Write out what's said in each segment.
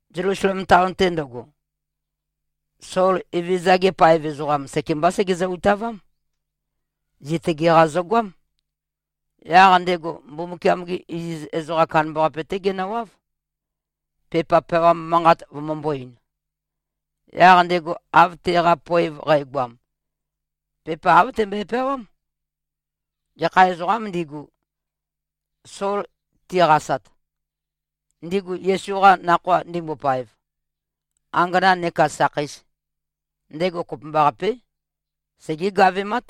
Zelusalem taon-te ndøgo, Sol Evezøza-gi paev ezoqam, sekembá sègezø-utavám. Zitøge-qa zøgoám. Yaq ndego Mbumbukiam-ge iziz ezoqam kandambaqape-té genøwáv, pepa peawam manqat vømømbō-ein. Yaq ndego, av teqa poev qægoam, pepa āv tembøe-peawám. Gekha ezoqām ndigu, Sol tiqasat, ndigu Yesu-qa Nakhoa ndimbopaev, angana nekā sakheis, ndego kopømbaqapé, segé-gavemát,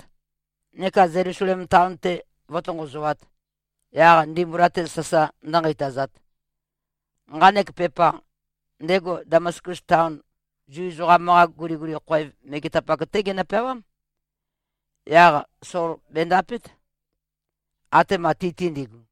neka Zelusalem taon-te vǿtonqozoāt, yaq ndimbula-te sasa ndǿnqeitazāt. Nqanek pepa, ndego Damaskus taon Zu ezoqam-qa guliguli khoev megetapak-té genø-peawám. Yaq Sol bèndapét, atema ti-te ndigu.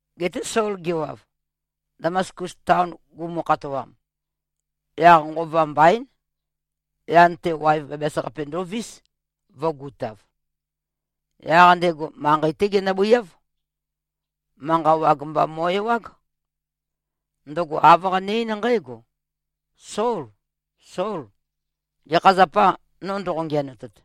Geté Sol gewav, Damaskus taon gumu-khatoam, yaq nqova mbaín, yan-te, waev bæbæs-qape ndovís, vø̄gutav. Yaq ndego manqei-té genøbøiáv. Manqa wag mba mo꞉-ewág. Ndøgo āv qane-eín nqǽgo, “Sol, Sol! Gekha zapâ, no ndoqo-ngiænotet?”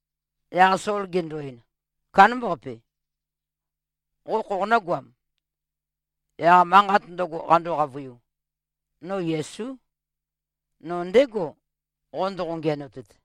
Yaq Sol gendo-ein, “Kándambaqape. Qo khoqonǿ-goam?” Yaq manqat ndøgo, qando-qavøiu, “No Yesú. No ndégo, qo ndoqo-ngiænotet.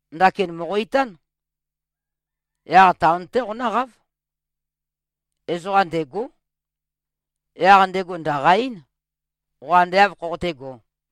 Ndakin mòqo-itán. Yaq taon-té qonǿqáv. Ezoqam ndêgó. Yaq ndego ndø̀qa-eín, qo ande āv khoqotégō.”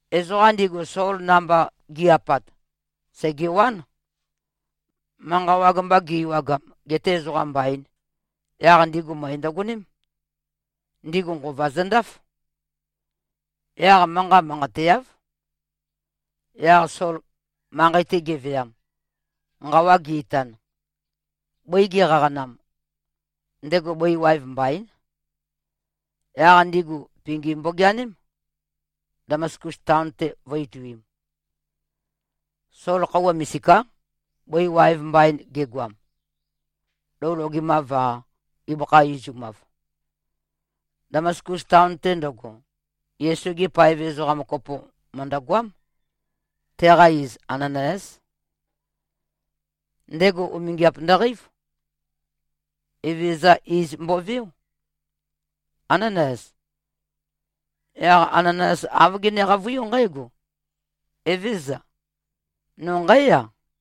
Ezoqam ndigu, Sol namba gi꞉-apat, sègewán. Manqa wag mba gi-ewagam, gete ezoqam mbain, yaq ndigu møe ndøgoném. Ndigu nqova zøndáf. Yaq manqa manqateáv. Yaq Sol manqei-te geveam, nqawa ge-itan, bøi geqaqanam, ndego bøi waev mbaín. Yaq ndigu pingi mbogeaném, Damaskus taon-te vø̄-ituim. Sol khøuwa misiká, bøi waev mbain gegoam. Lou logemāv-a, ibøkha izumav. Damaskus taon-te ndøgo, Yesu-ge paev ezoqam kopo mø̀ndøgoám. Teqa iz Ananayás. Ndego umingiap ndøqeív. Evezøza iz mboveó, “Ánanayas.” Yaq Ananayas āv gene-qavøiú nqǽgo, “Evézøza. No nqǽya.”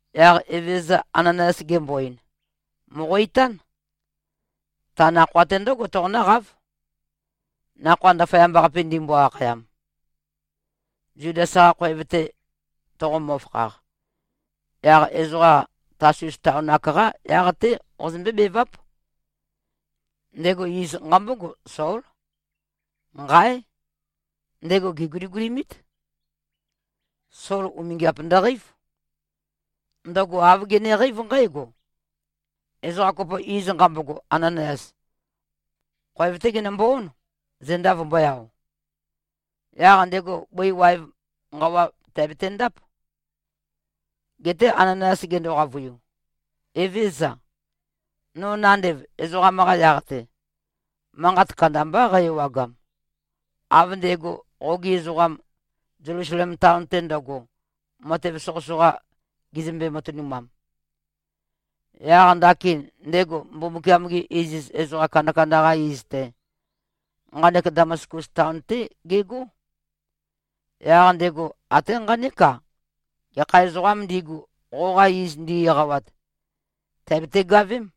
Yaq Evezøza Ananayas gembo-ein, “Mòqo-itán. Ta nakhoa-té ndǿgo toqonǿqáv, Nakhoa Ndaføyamba-qape ndimbo-akhayam. Zudas-qa khoev-te toqomø-fakhaq, yaq ezoqa Tasus taon-ak-qá yaq-té qozømbé-beváp. Ndego iz nqambógo, Sól. Nqáe! Ndego gèguligulimít. Sol umingiap ndøqeív. Ndøgo āv geneqeív nqǽgo: Ezoqa kopo, iz nqambogo Ananayas, khoev-té genømbo-ón, zenda vømbø̄e-ao. Yaq ndego bøi waev nqawa tèabetendáp.” Geté Ananayas gendo-qavøiu, “Evézøza. No nandev ezoqam-qa yaq-te, manqat kandambá qæ-ewagam, av ndego qogi ezoqam, Zelusalem taon-te ndøgo, matev soqøsoqa gezømbe-matønumam. Yaq ndakin ndego Mbumbukiam-gi iziz ezoqa kandakanda-qa iz-te, nqanek Damaskus taon-té gegó. Yaq ndego até nqanék-a, gekha ezoqām ndigu, qoqa iz ndi-eqawat, tèabete-gavém.”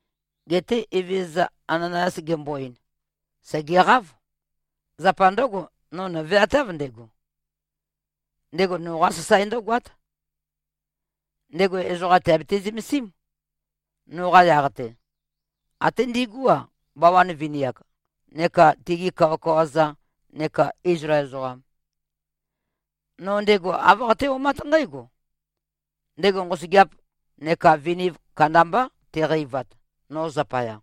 Geté Evezøza Ananayas gembo-ein, “Sègeqáv! Zapa ndǿgo, no nø̀veatáv, ndego. Ndego noqá sasae ndǿgoát. Ndego ezoqa tèabete-zømesím, noqa yaq-te, até ndigú-a, bawan vini-ak neka tigi kawakawa-za neka Izlael ezoqam. No ndego āv qaté-omát nqǽgo: Ndego nqosøgeap neka viniv kandambá teqeivat, no zapaya.”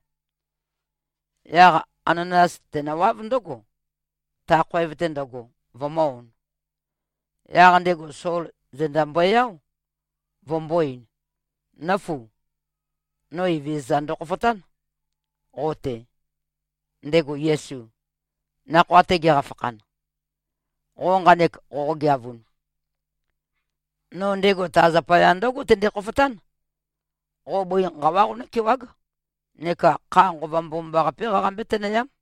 Yaq Ananayas tenøwáv ndǿgo, ta khoev-te ndøgo, vømø̄-on. Yaq ndego Sol zenda mbøe-áo, vømbō-ein, “Nǿfu! No Evezøza ndokhofotán, qo-te, ndego Yesu, nakhoa-te geqafakhan, qo nqanek qoqogeavun. No ndego ta zapaya ndǿgo tende-khofotán. Qo bøi nqawá qonǿkewág, neka kha Nqova Mbomambaqapé qaqambé-tønøyám.”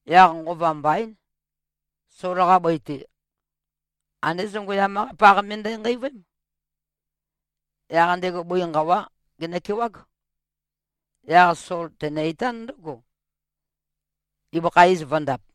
Yaq nqova mbaín, Sol-qa bøi-te, andé zongøyam-qá paq me ndenqeivøém. Yaq ndego bøi nqawá genøkewág. Yaq Sol tenø-itán ndǿgo, ibøkha iz vø̄ndap.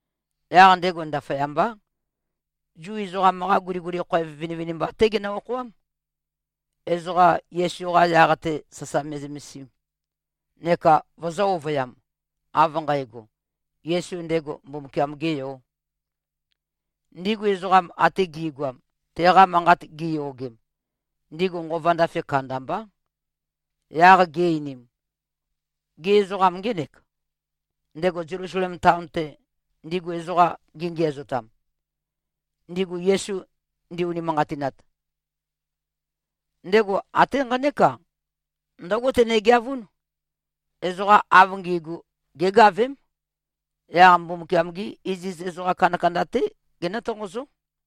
Yaq ndego ndaføyambá, Zu ezoqam-qa guliguli khoev vinivinimba-té genø-okhoám, ezoqa Yesu-qa yaq-te sasa me꞉zømesim, neka vøzø̄-ovøyam, av nqægo, Yesu ndego Mbumbukiam-gē Yō. Ndigu ezoqam ate gi꞉goam, teqa manqat giyogem, ndigu nqova ndafe kandambá. Yaq gi-einim, “Gê, ezoqam ngénèk, ndego Zelusalem taon-te, ndigu ezoqam gengiæzotam, ndigu Yesu ndi-unimanqatinat? Ndego até nqanék-a, ndǿgo tenegeavún, ezoqa av ngi꞉gu gégavém, yaq Mbumbukiam-gí iziz ezoqa kandakanda-té genǿ-tonqozó.”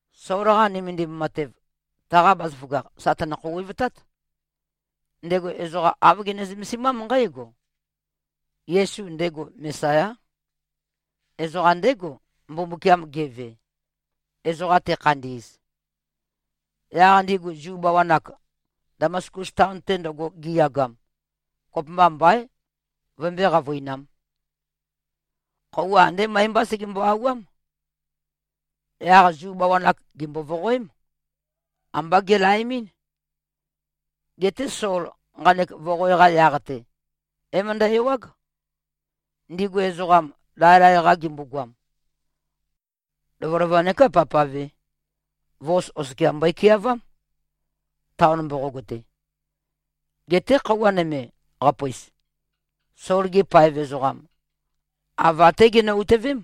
Sol-qa nømendim matev, taqa bazaføgakh sà tønø-khouwevtát. Ndego ezoqa āv gene-zømesimám nqǽgo: Yesu ndego Mesayá. Ezoqam ndégo, Mbumbukiam geve, ezoqa tekhandi꞉z. Yaq ndigu Zu bawan-ak, Damaskus taon-te ndøgo giyagam, kopømba mbaín, vømbøé-qavøinām. Khøuwa andé møe-mbá segembo-auwám. Yaq Zu bawan-ak gèmbo-voqoém. Ambá gelaemɨ́n. Geté Sol nqanek voqoe-qa yaq-te, é-møndæ-ewág. Ndigu ezoqam, laelae-qa gimbogoam, lovølova neká pavpave, vos oskia mbøe-keavám, taon mboqog-te. Geté khøuwa nøme, qapøis, Sol-gi paev ezoqam, ava-té ginø-utøvém,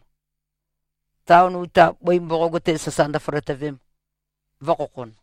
taon uta bøi mboqog-te sasa ndøføløtøvem, vø̄khokhon.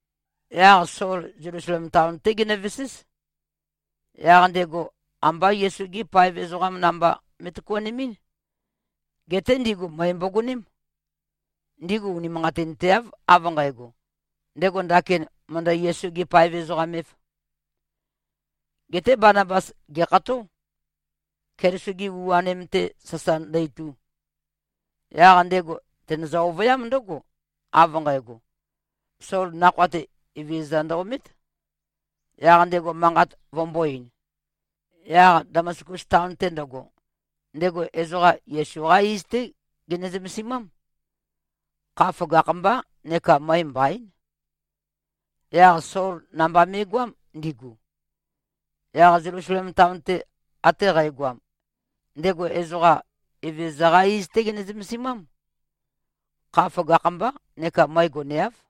Yaq Sol Zelusalem taon-té genøveséz. Yaq ndego ambá Yesu-gi paev ezoqam namba me꞉tøkuanemɨ́n. Geté ndigu møe mbogoném. Ndigu unimanqatinteáv, av nqægo, ndego ndakin mø̀ndø-Yesu-gē-paev-ezoqam-ēv. Geté Banabas gèkható, Keliso-gi u-anim-te sasa ndø-itu. Yaq ndego tènøzø-ovøyám ndǿgo, av nqægo, Sol nakhoa-te Evezøza ndø-omét, yaq ndego manqat vømbō-ein. Yaq Damaskus taon-te ndøgo, ndego ezoqa Yesu-qá iz-té gene-zømesimám. Kha føgakh-mbá neka møe mbaín. Yaq Sol namba me꞉goám, ndigu. Yaq Zelusalem taon-te ate qægoam, ndego ezoqa, Evezøza-qá iz-té gene-zømesimám. Kha føgakh-mbá neka møe goneáv.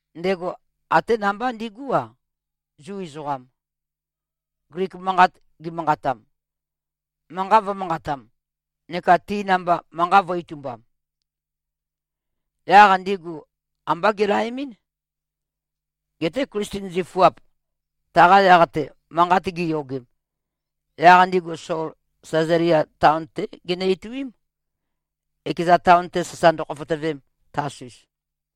Ndego até namba ndigú-a, Zu ezoqam, Glik manqat gimanqatam, manqa vø̄manqatam, neka ti namba manqa vø̄-itumbam. Yaq ndigu ambá gelaemɨ́n. Geté Klisten zifuap, taqa yaq-te manqat giyogem, yaq ndigu Sol Sæzalia taon-té ginø-ituím, ekeza taon-te sasa ndøkhofotøvem, Tasus.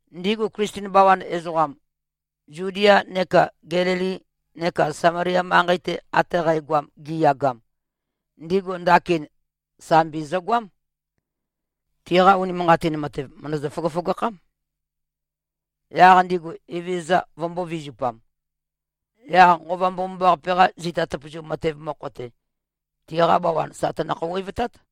Ndigu Klisten bawan ezoqam, Zudia neka Gelili neka Samalia manqei-te ate qægoam giyagam, ndigu ndakin sambi zøgoám. Tiqa unimanqatin matev, mø̀ndøzø-føgøføgakhám, yaq ndigu Evezøza vømbō-vizupam. Yaq Nqova Mbomambaqape-qa zita tøpøzu matev mokho-te, tiqa bawan sà tønø-khouwevtát.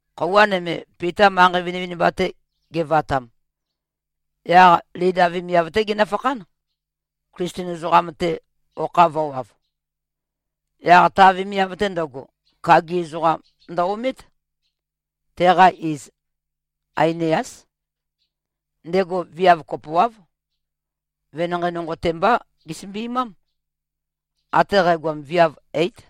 Khøuwa nøme, Pita manqei vinivinimba-te gevatam, yaq Lida vemiav-té genøfakhán, Klisten ezoqam-te okha vø̄wav. Yaq ta vemiav-te ndøgo, kagi ezoqam ndø-omét. Teqa iz Ainiás. Ndego viav kopoáv, venanqei nonqo-te mbá gesømbimám. Até qægoam, viav eít.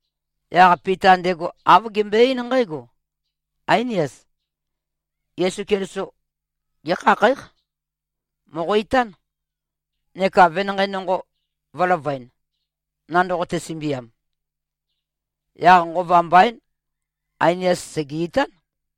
Yaq Pita ndego āv gembøe-eín nqǽgo, “Áinias. Yesu Keliso gékhakhǽq. Mòqo-itán, neka venanqei nonqo vø̄løvøen, nandoqote-sømbiam.” Yaq nqova mbaín, Ainias sège-itán.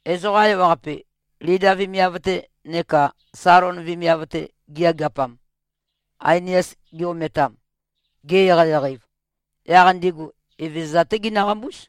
Ezoqa ewaqape, Lida vemiav-te neka Salon vemiav-te giyageapam, Ainias gi-ometam, ge-eqeieqei-ev, yaq ndigu Evezøza-té ginøqambúz.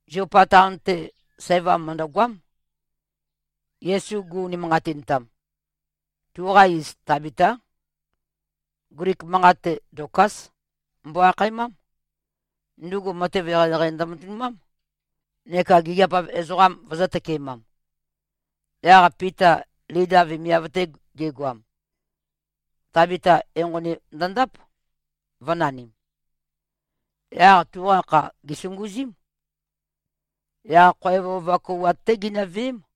Ziopa taon-te, sævam mø̀ndøgoám, Yesu gu-unimanqatintam. Tuqa iz Tabitá. Glik manqat-te, Dokas mbo-akhaemám. Ndugu matev eqeieqei ndømatønumám, neka gigiap-av ezoqam vøzø̄-tøkemam. Yaq Pita Lida vemiav-te gegoam, Tabita enqoni ndøndáp, vø̄nanim. Yaq tuqa kha gèsunguzím. Yaq khoev ova kouwat-té ginøveém.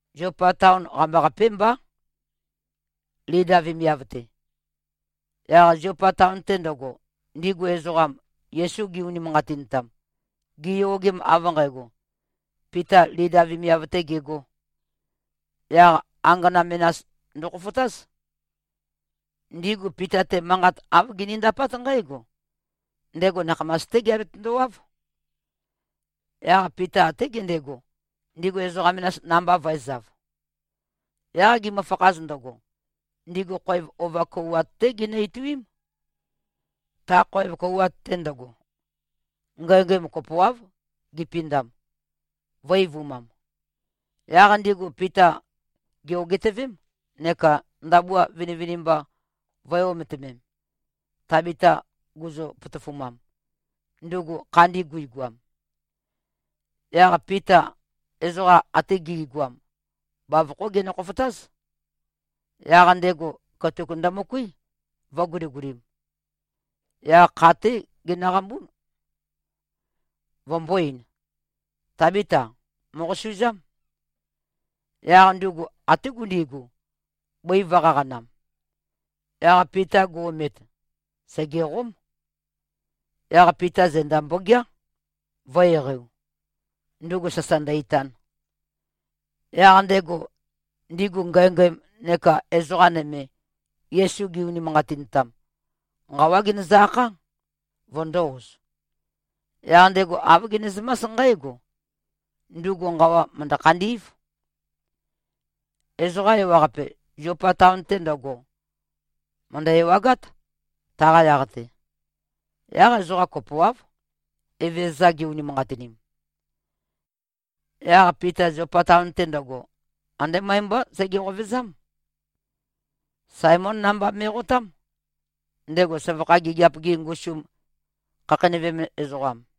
Ziopa taon qambaqapé mbá, Lida vemiav-te. Yaq Ziopa taon-te ndøgo, ndigu ezoqam, Yesu gi-unimanqatintam, giyogem av nqægo, Pita Lida vemiav-tē gegō, yaq angana menas ndøkhofotáz. Ndigu Pita-te, manqat āv ginindapát nqǽgo: Ndego nakhamas-té geabetøndo-wáv. Yaq Pita até gendego, ndigu ezoqa menas namba vø̄ezav. Yaq gimøfakhaz ndøgo, ndigu khoev ova kouwat-té ginø-ituím. Ta khoev kouwat-te ndøgo, ngængæm kopoáv gipindam, vø̄-eivumam. Yaq ndigu Pita gè-ogitøvém, neka ndabua vinivinimba vø̄e-ometømem, Tabita guzø-potofumam, ndugu khandi guigoam. Yaq Pita ezoqa ate gi꞉goam, bavokhó genø-khofotáz. Yaq ndego katuk ndømøkuí, vø̄guligulim. Yaq kha-té genøqambún, vømbō-ein, “Tábita, mòqosuzám.” Yaq ndugu até gundigu, bøi vø̄-qaqanam. Yaq Pita gu-omet, sègeqóm. Yaq Pita zenda mbogeá, vø̄-eqeiu, ndugu sasa ndø-itan. Yaq ndego, ndigu ngængæm neka ezoqa nøme, Yesu gi-unimanqatintam, nqawá genøzø-akhá, vøndō-oz. Yaq ndego āv genezømás nqǽgo: Ndugu nqawa mø̀ndø-khandí꞉v. Ezoqa ewaqape, Ziopa taon-te ndøgo, mø̀ndø-ewagát, taqa yaq-te. Yaq ezoqa kopoáv, Evezøza gi-unimanqatinim. Yaq Pita Ziopa taon-te ndøgo, andé møe-mbá sege-qovezám. Saemón namba me꞉qotám, ndego søvakha gigiap-gi ngusum khakheinøvem ezoqam.